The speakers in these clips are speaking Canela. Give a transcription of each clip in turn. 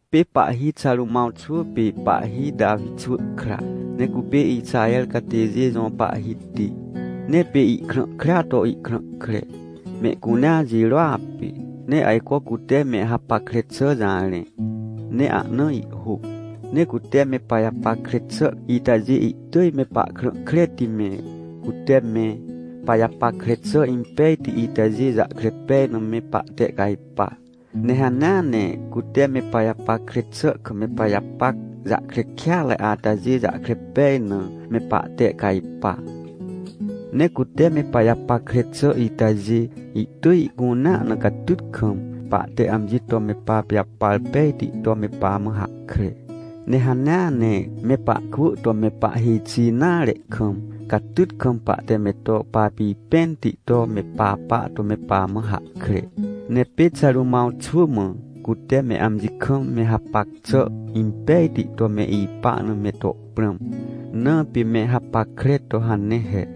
Pê pahhi Xarômãw xwỳ pê pahhi Tawi xwỳ kra, ne cupê Ixaher catêjê jõ pahhiti. Ne pê ihkrã krea to ihkrã kre, mehcunea jirôa pê, ne ajco cute me hapackre xà jarẽ, ne ahna ihhôc. Ne cute me pajapackre xà itajê, ihtỳj me pahkrã kreti me, cute me pajapackre xà impejti itajê jahkre pej na me pahtehcajpa, ne hanea ne cute me pajapackre xà kam me pajapac jahkre kêatre atajê jahkre pej na, me pahtehcajpa. Ne cute me pajapackre xà itajê, ihtỳj ihcunea na catyt kam pahte amji to me papijapar pejti to me pamã hahkre. Ne hanea ne me pahkwỳ to me pahhêj xi nare kam, catyt kam pahte me to papipẽnti to me papa to me pamã hahkre. Ne pê Xarômãw xwỳ mã, cute me amji kam me hapac xà impejti to me ipa na me to prãm, na pê me hapackre to hane he.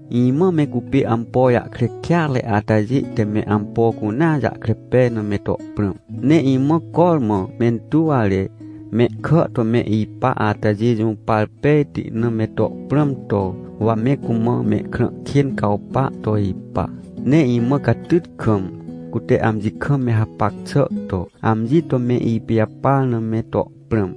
Imã me cupê ampo jahkre kêatre atajê te me ampo cunea jahkre pej na me to prãm. Ne imã cormã mentuwre, mehkà to me ipa atajê jũpar pejti na me to prãm to, wa me cumã mehkrã kên cawpa to ipa. Ne imã catyt kam, cute amji kam me hapac xà to, amji to me ipijapar na me to prãm.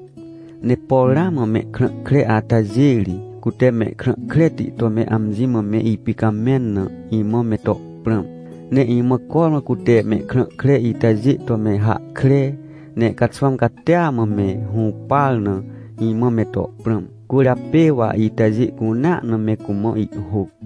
Ne por ramã mehkrã kre atajê ri, cute mehkrã kreti to me amji mã me ipicamẽn na, imã me to prãm. Ne imã cormã cute mehkrã kre itajê to me hahkre, ne caxwãm catia mã me hũpar na, imã me to prãm, cwỳrjapê wa itajê cunea na me cumã ihhôc.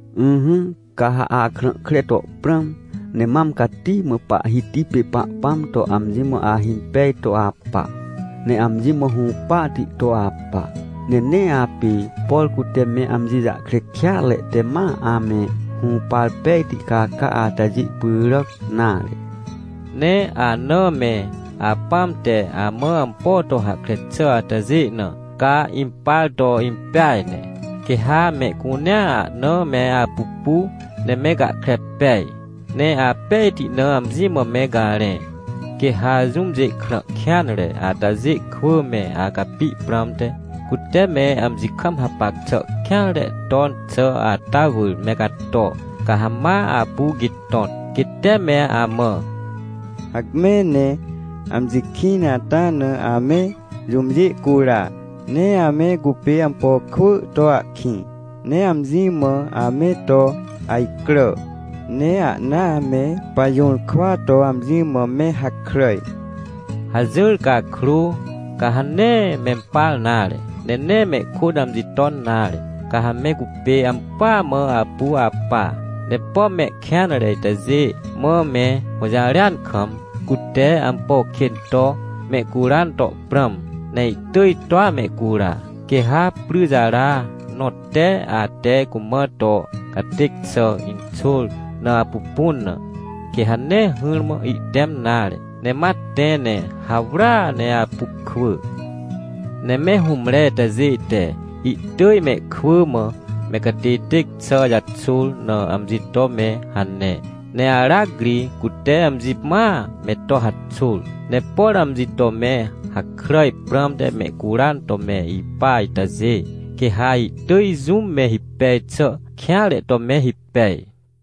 Ỹhỹ, ca ha akrã kre to prãm, ne mam cati mã Pahhiti pê Pahpãm to amji mã ahimpej to apa, ne amji mã hũpahti to apa. Ne nee apê, por cute me amji jahkre kêatre te ma ame hũpar pejti caca atajê pyràc nare. Ne anã me apãm te amã ampo to hahkre xà atajê na, ca impar to impeaj ne. Quê ha mehcunea ahna me apupu, ne me gahkre pej, ne apejti na amji mã me garẽ. Quê ha jũmjê krã kêanre atajê kwỳ me acapi prãmte, cute me amji kam hapac xà kêanre ton xà ata wỳr me gato, ca ha ma apu gitõt. Quê te me amã: — Hacme ne amji kĩn ata na ame jũmjê cura, ne ame cupê ampo kwỳ to ahkĩ, ne amji mã ame to ajcrà, ne ahnaa me pajũrkwa to amji mã me hakràj — hajỹr cakrô, ca ha nee mempar nare, ne nee mehkôt amji ton nare. Ca ha me cupê ampỳa mã apu apa. Ne pom mehkêanre itajê mã me hũjarêan kam, cute ampo kên to mehcuran to prãm, ne ihtỳj toa mehcura. Quê ha pryjara nõ te, ate cumã to catêc xà inxôr na apupun na, quê ha nee hỹrmã ihtẽm nare, ne ma tẽ ne hawrya ne apu kwỳ. Ne me hũmre itajê te ihtỳj mehkwỳ mã me catêtêc xà jaxôr na amji to me hane, ne aracri cute amji mãa me to haxôr. Ne por amji to me hakràj prãmte mehcuran to me ipa itajê, quê ha ihtỳj jũm me hipej xà kêanre to me hipej.